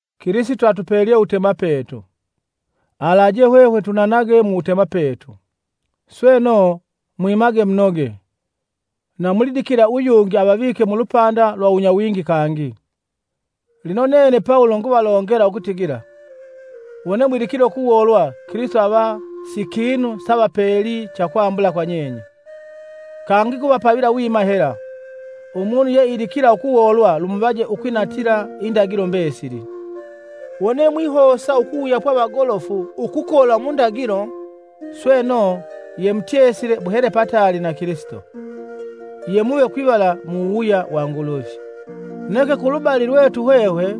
Kilisito atupelye uwutemapetu, alaje hwehwe tunanage muwutemapetu, sweno, mwimage munoge, na mulidikila uyungi avavike mulupanda lwa uwunyawingi kangi. Lino nene Pawulo nguvalongela ukutigila! Wone mwidikile ukuwoolwa Kilisito ava sikinu savapeli cha kwambula kwa nyenye. Kangi nguvapavila wima hela: umunu yeidikila ukuwoolwa lumuvaje ukwinatila, indagilo mbesili. Wone mwihosa ukuwuyapwa vagolofu ukukola mu ndagilo, sweno, yemutyesile muhele pataali na Kilisito: Yemuve kwivala mu wuwuya wa Nguluvi. Neke kulubali lwetu hwehwe,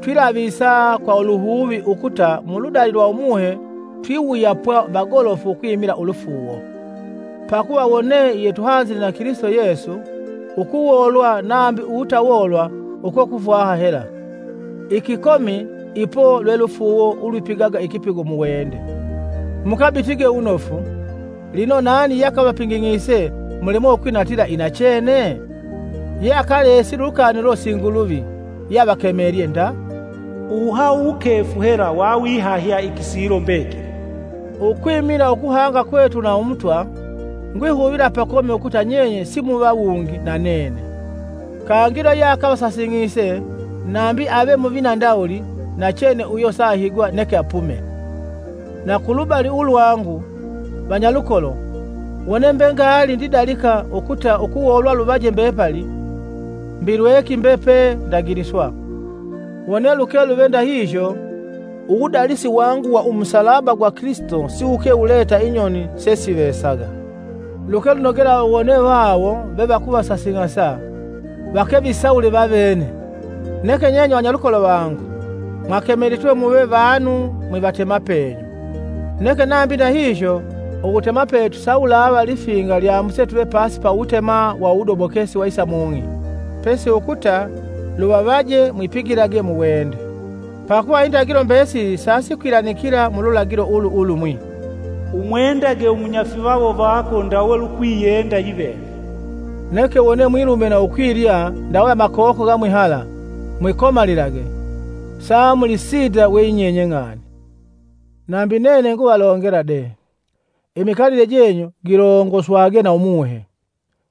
twilavisa kwa luhuvi ukuta muludali lwa Umuhe twiwuyapwa vagolofu ukwimila ulufuuwo. Pakuva wone yetuhanzile na Kilisito Yesu, ukuwoolwa nambi uwutawoolwa uko kufwaha hela, ikikomi ipo lwe lufuuwo ulwipigaga ikipigo muwende. Mukabitige wunofu, minofu! Lino, nani yeakavapinging'ise mulemwe ukwinatila inachene? Yeakalesile ulukani ulo si Nguluvi yeavakemelye nda. “Uwuhahu wukefu hela wawihahya ikisilo mbekili!” Ukwimila ukuhanga kwetu na Umutwa, ngwihuvila pakomi ukuta nyenye simuva wungi na nene. Kangi yula yeakavasasing'ise nambi ave muvina ndawuli nachene uyo saahigwa neke apume. Na kulubali ulwangu, vanyalukolo, wone mbe ngaali ndidalika ukuta ukuwolwa luvaje mbepali, mbi lweki mbe pe ndagiliswa. Wone luke luve ndahihyo, uwudalisi wangu wa umusalaba wa Kilisito siwuke wuleta inyoni sesivesaga. Luke lunogela wone vawo vevakuvasasing'asa, vake visawule vavene! Neke nyenye vanyalukolo vangu mwakemelitwe muve vanu mwivatemapenyu. Neke nambi ndahihyo uwutemapetu sawulava lifinga lyambuse tuve pasi ya wutema wa uwudobokesi wa isa mung'i; pesi ukuta luvavaje mwipigilage muwende. Pakuva indagilo mbesili sasikwilanikila mululagilo ulu ulumwi, “Umwendage umunyafivawo vako ndawe lukwiyenda yiveve.” Neke wone mwilume na ukwilya ndawe amakoko ga mwihala, mwikomalilage samulisinda we yinyenye ng'ani! Nambi nene nguvalongela de, imikalile jenyu gilongoswage na Umuhe,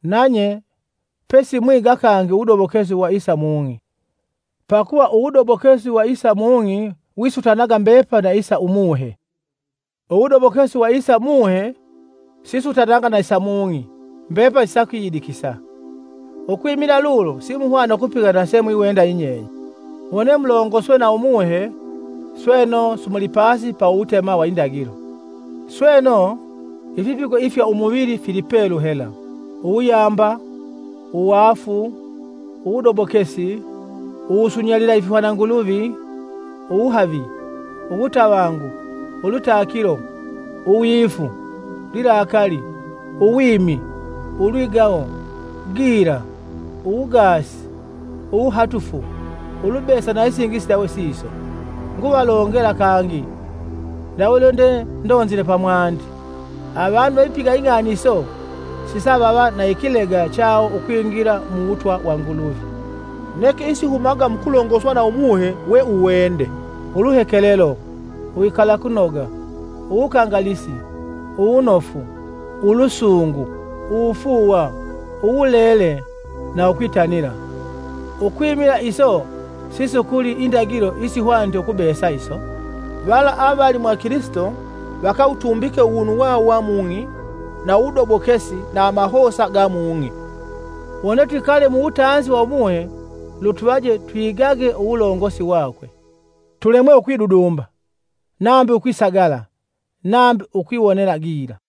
nanye pesimwiga kangi uwudobokesi wa isa mung'i. Pakuva uwudobokesi wa isa mung'i wisutanaga mbepali na isa Umuhe, uwudobokesi wa isa umuhe sisutanaga na isa umuhe mbepali sisakwiyidikisa, ukwimila lulo simuhwana ukupiga na semwiwenda yinyenye. Wone mulongoswe na Umuhe, sweno, simuli pasi ya uwutema wa indagilo. Sweno, ifipigo ifya umuvili fili pelu hela; uwuyamba, uwaafu, uwudobokesi, uwusunyalila ifihwananguluvi, uwuhavi, uwutavangu, ulwitakilo, uwifu, lilakali, uwimi, ulwigawo, gila, uwugaasi, uwuhatufu, ulubesa na isingi isindawe siso. Nguvalongela kangi ndawe lwendendonzile pamwandi avanu vevipiga ing'ani iso, sisavava na ikilega chawo ukwingila muwutwa wa Nguluvi. Neke isihumaga mukulongoswa na Umuhe we uwende, uluhekelelo, uwikalakunoga, uwukangalisi, uwunofu, ulusungu, uwufuuwa, uwulele na ukwitanila, ukwimila iso sisukuli indagilo isihwanite ukubesa iso. Vala avali mwa Kilisito vakawutumbike uwunu wawo wa mung'i na uwudobokesi na amahosa ga mung'i. Wone twikale muwutanzi wa Umuhe, lutuvaje twigage uwulongosi wakwe. Tulemwe ukwidudumba, nambi ukwisagala nambi ukwiwonela gila.